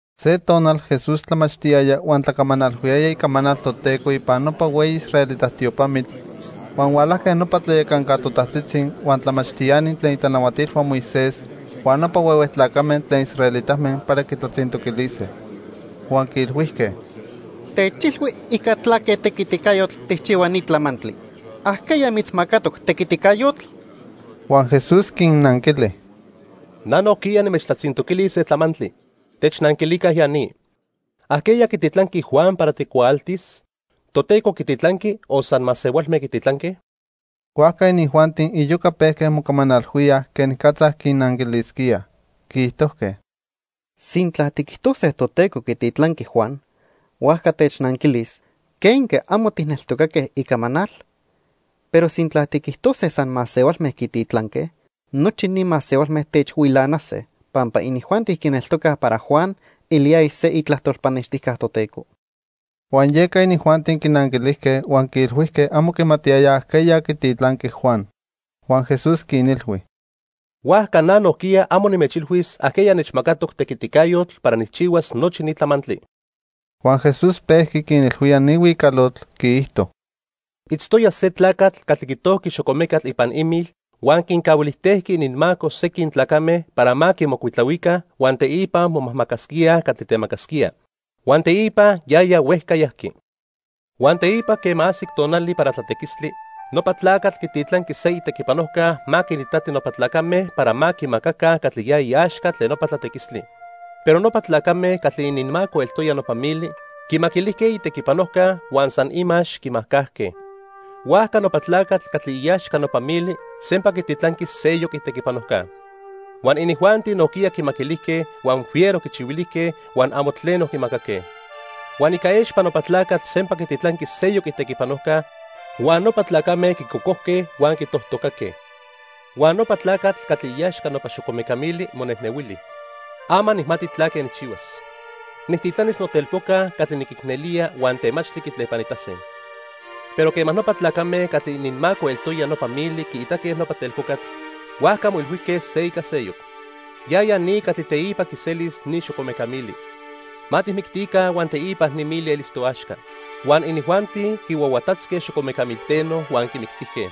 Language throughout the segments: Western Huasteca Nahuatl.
Se tonal Jesús tlamachtiyaya huan tlacamanalhuiyaya icamanal Toteco ipan nopa hueyi israelita tiopamitl, huan hualajque nopa tlayacanca totajtzitzi, huan tlamachtiani tlen itlanahuatilhua Moisés, huan nopa huehue tlacame tlen israelitame para quitlatzintoquilise. Huan quiilhuijque: —Techilhui ica tlaque tequiticayotl tijchihua ni tlamantli. ¿Ajqueya mitzmacatoc tequiticayotl? Huan Jesús quinnanquili: —Na nojquiya nimechtlatzintoquilis se tlamantli. Technanquilica ya ni. ¿Ajqueya quititlanqui Juan para tecuaaltis? ¿Toteco quititlanqui o san masehualme quititlanque? Huajca inijuanti iyoca pejque mocamanalhuíaj quenicatza quinanquilisquíaj. Quiijtojque: "Sintla tiquijtose Toteco quititlanqui Juan, huajca technanquilis ¿quenque amo tijneltocaque icamanal? Pero sintla tiquijtose san masehualme quititlanque, nochi ni masehualme techhuilanase pampa inijuanti quineltocaj para Juan eliyaya se itlajtol pannextijca Toteco." Huan yeca inijuanti quinanquilijque, huan quiilhuijque amo quimatiyayaj ajqueya quititlanqui Juan. Huan Jesús quinilhui: —Huajca na nojquiya amo nimechilhuis ajqueya nechmacatoc tequiticayotl para nijchihuas nochi ni tlamantli. Huan Jesús pejqui quinilhuía ni huicalotl, quiijto: "Itztoya se tlacatl catli quitojqui xocomecatl ipan imil huan quincahuilijtejqui ininmaco sequin tlacame para ma quimocuitlahuica huan teipa momajmacasquíaj catli temacasquía. Huan teipa yaya huejca yajqui. Huan teipa quema ajsic tonali para tlatequistli, nopa tlacatl quititlanqui se itequipanojca ma quinitati nopa tlacame para ma quimacaca catli ya iaxca tlen nopa tlatequistli. Pero nopa tlacame catli ininmaco eltoya nopa mili quimaquilijque itequipanojca huan san imax quimajcajque. Huajca nopa tlacatl catli iaxca nopa mili sempa quititlanqui seyoc itequipanojca. Huan inijuanti nojquiya quimaquilijque, huan fiero quichihuilijque huan amo tleno quimacaque. Huan ica expa nopa tlacatl sempa quititlanqui seyoc itequipanojca, huan nopa tlacame quicocojque huan quitojtocaque. "Huan nopa tlacatl catli iaxca nopa xocomeca mili monejnehuili: 'Ama nijmati tlaque nijchihuas. Nijtitlanis notelpoca catli niquicnelía huan temachtli quitlepanitase.' Pero quema nopa tlacame catli ininmaco eltoya nopa mili quiitaque nopa telpocatl, huajca moilhuijque se ica seyoc: 'Yaya ni catli teipa quiselis ni xocomeca mili. Ma tijmictica huan teipa ni mili elis toaxca.' Huan inijuanti quihuahuatatzque xocomeca milteno huan quimictijque.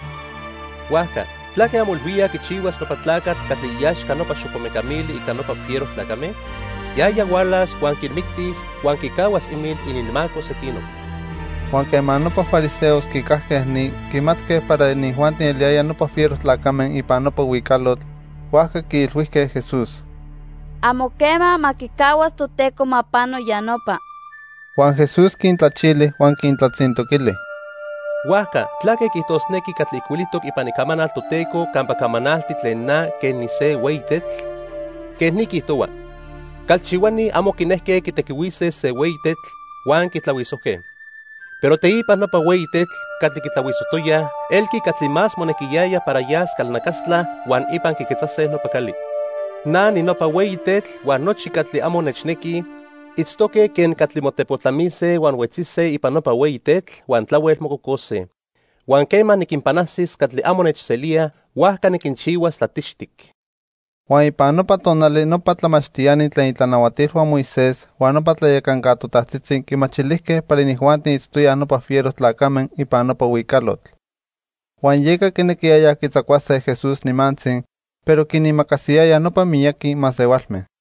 "Huajca ¿tlaque anmoilhuíaj quichihuas nopa tlacatl catli iaxca nopa xocomeca mili ica nopa fiero tlacame? Yaya hualas huan quinmictis huan quicahuas imil ininmaco sequinoc." Huan quema nopa fariseos quicajque ni, quimatque para inijuanti eliyayaj nopa fiero tlacame ipan nopa huicalotl, huajca quiilhuijque Jesús: —¡Amo quema ma quicahuas Toteco ma pano ya nopa! Huan Jesús quintlachili huan quintlatzintoquili: —Huajca ¿tlaque quiijtosnequi catli ijcuilijtoc ipan Icamanal Toteco campa camanalti tlen na quen nise hueyi tetl? Quej ni quiijtohua: 'Calchihuani amo quinejque quitequihuise se hueyi tetl, huan quitlahuisojque. Pero teipa nopa hueyi tetl catli quitlahuisojtoyaj, elqui catli más monequiyaya para yas calnacastla huan ipan quiquetzase nopa cali.' Na ninopa hueyi tetl huan nochi catli amo nechnequij itztoque quen catli motepotlamise huan huetzise ipan nopa hueyi tetl, huan tlahuel mococose. Huan quema niquinpanajsis catli amo nechselíaj, huajca niquinchihuas tlatixtic. Huan ipan nopa tonali nopa tlamachtiani tlen itlanahuatilhua Moisés huan nopa tlayacanca totajtzitzi quimachilijque para inijuanti itztoyaj nopa fiero tlacame ipan nopa huicalotl. Huan yeca quinequiyayaj quitzacuase Jesús nimantzi, pero quinimacasiyayaj nopa miyaqui masehualme.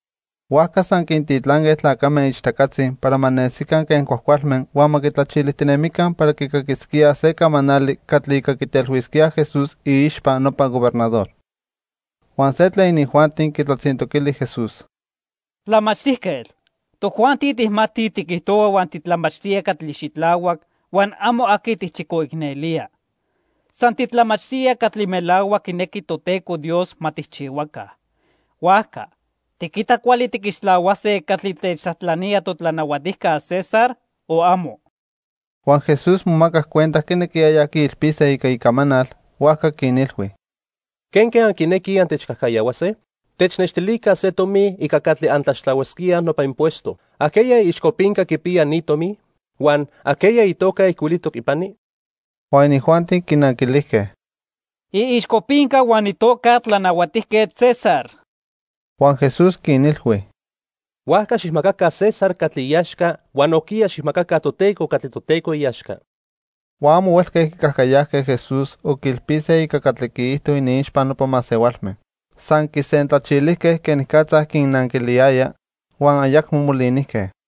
Huajca san quintitlanque tlacame ichtacatzi para ma nesica quen cuajcualme huan ma quitlachilijtinemica para quicaquisquíaj se camanali catli ica quitelhuisquíaj Jesús iixpa nopa gobernador. Huan se tlen inijuanti quitlatzintoquili Jesús: —Tlamachtijquetl, tojuanti tijmatij tiquijtohua huan titlamachtía catli xitlahuac huan amo aqui tijchicoicnelía. San titlamachtía catli melahuac quinequi Toteco Dios ma tijchihuaca. Huajca ¿tiquita cuali tiquixtlahuase catli techtlajtlanía totlanahuatijca César o amo? Huan Jesús momacac cuenta quinequiyayaj quiilpise ica icamanal, huajca quinilhui: —¿Quenque anquinequij antechcajcayahuase? Technextilica se tomi ica catli antlaxtlahuasquíaj nopa impuesto. ¿Ajqueya iixcopinca quipiya ne tomi? Huan ¿ajqueya itoca ijcuilijtoc ipani? Huan inijuanti quinanquilijque: —Iixcopinca huan itoca Tlanahuatijquetl César. Huan Jesús quinilhui: —Huajca xijmacaca César catli iaxca huan nojquiya xijmacaca Toteco catli Toteco iaxca. Huan amo huelque quicajcayajque Jesús o quiilpise ica catli quiijto iniixpa nopa masehualme. San quisentlachilijque quenicatza quinnanquiliyaya, huan ayacmo molinijque.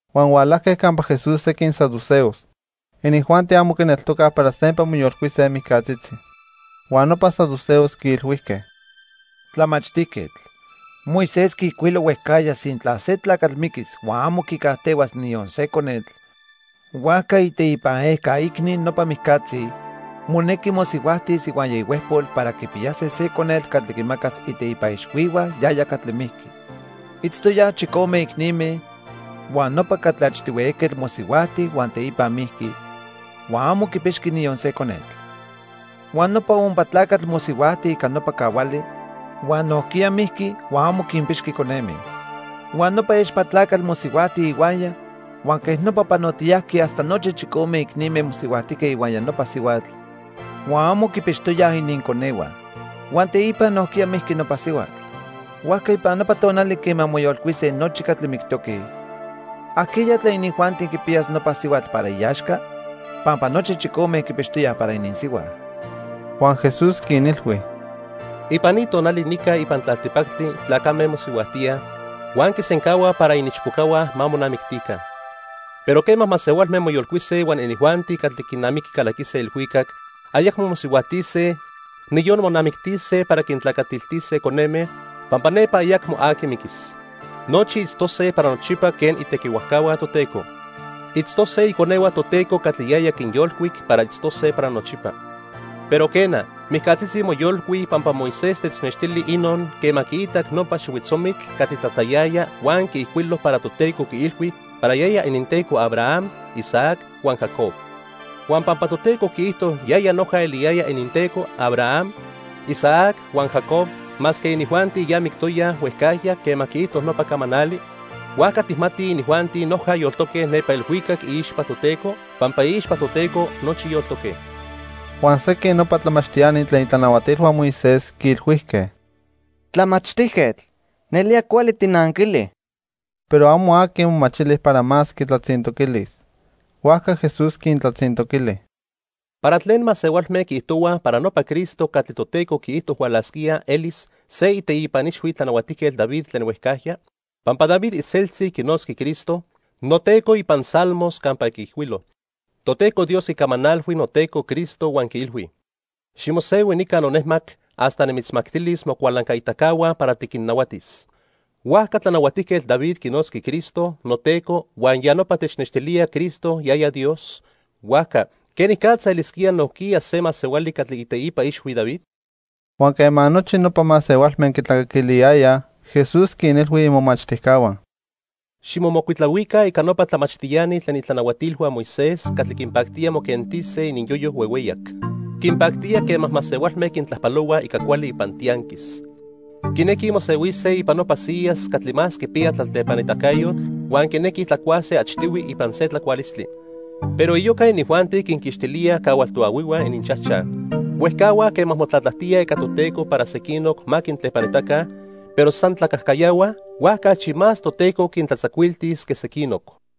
Huan hualajque campa Jesús sequin saduceos. Inijuanti amo quineltocaj para sempa moyolcuise mijcatzitzi. Huan nopa saduceos quiilhuijque: —Tlamachtijquetl, Moisés quiijcuilo huejcajya sintla se tlacatl miquis huan amo quicajtehuas niyon se conetl, huajca iteipan ejca icni nopa mijcatzi monequi mosihuajtis ihuaya ihuejpol para quipiyase se conetl catli quimacas iteipa ixhuihua yaya catli mijqui. Itztoyaj chicome icnime huan nopa catli achtihui ejquetl mosihuajti huan teipa mijqui, huan amo quipixqui niyon se conetl. Huan nopa ompa tlacatl mosihuajti ica nopa cahuali, huan nojquiya mijqui huan amo quinpixqui coneme. Huan nopa expa tlacatl mosihuajti ihuaya huan quej nopa panotiyajqui hasta nochi chicome icnime mosihuajtijque ihuaya nopa sihuatl, huan amo quipixtoyaj ininconehua. Huan teipa nojquiya mijqui nopa sihuatl. Huajca ipan nopa tonali quema moyolcuise nochi catli mictoque, ¿ajqueya tlen inijuanti quipiyas nopa sihuatl para iaxca?, pampa nochi chicome quipixtoyaj para ininsihua. Huan Jesús quinilhui: —Ipan ni tonali nica ipan tlaltipactli tlacame mosihuajtíaj, huan quisencahuaj para iniichpocahua ma monamictica. Pero quema masehualme moyolcuise huan inijuanti catli quinamiqui calaquise ilhuicac, ayacmo mosihuajtise, niyon monamictise para quintlacatiltise coneme, pampa nepa ayacmo aqui miquis. Nochi itztose para nochipa quen itequihuajcahua Toteco. Itztose iconehua Toteco catli yaya quinyolcuic para itztose para nochipa. Pero quena, mijcatzitzi moyolcuij pampa Moisés technextili inon quema quiitac nopa xihuitzomitl catli tlatlayaya huan quiijcuilo para Toteco quiilhui para yaya ininTeco Abraham, Isaac huan Jacob. Huan pampa Toteco quiijto yaya noja eliyaya ininTeco Abraham, Isaac huan Jacob masque inijuanti ya mictoyaj huejcajya quema quiijto nopa camanali, huajca tijmatij inijuanti noja yoltoque nepa ilhuicac iixpa Toteco, pampa iixpa Toteco nochi yoltoque. Huan sequin nopa tlamachtiani tlen itlanahuatilhua Moisés quiilhuijque: —Tlamachtijquetl, nelía cuali tijnanquili. Pero amo aqui momachili para más quitlatzintoquilis. Huajca Jesús quintlatzintoquili: —¿Para tlen masehualme quiijtohuaj para nopa Cristo catli Toteco quiijto hualasquía elis se iteipa ixhui Tlanahuatijquetl David tlen huejcajya? Pampa David iseltzi quinotzqui Cristo: 'noTeco' ipan Salmos campa quiijcuilo: 'Toteco Dios quicamanalhui noTeco Cristo huan quiilhui: Ximosehui nica nonejmac, hasta nimitzmactilis mocualancaitacahua para tiquinnahuatis.' Huajca Tlanahuatijquetl David quinotzqui Cristo 'noTeco' huan ya nopa technextilía Cristo yaya Dios, huajca ¿quenicatza elisquía nojquiya se masehuali catli iteipa ixhui David? Huan quema nochi nopa masehualme quitlacaquiliyayaj, Jesús quinilhui imomachtijcahua: "Ximomocuitlahuica ica nopa tlamachtiani tlen itlanahuatilhua Moisés catli quinpactía moquentise ininyoyo huehueyac. Quinpactía quema masehualme quintlajpalohuaj ica cuali ipan tianquis. Quinequij mosehuise ipan nopa siyas catli más quipiya tlatlepanitacayotl huan quinequij tlacuase achtihui ipan se tlacualistli. Pero iyoca inijuanti quinquixtilíaj cahual toahuihua ininchajchaj. Huejcahuaj quema motlatlajtíaj ica Toteco para sequinoc ma quintlepanitaca, pero san tlacajcayahuaj, huajca achi más Toteco quintlatzacuiltis que sequinoc."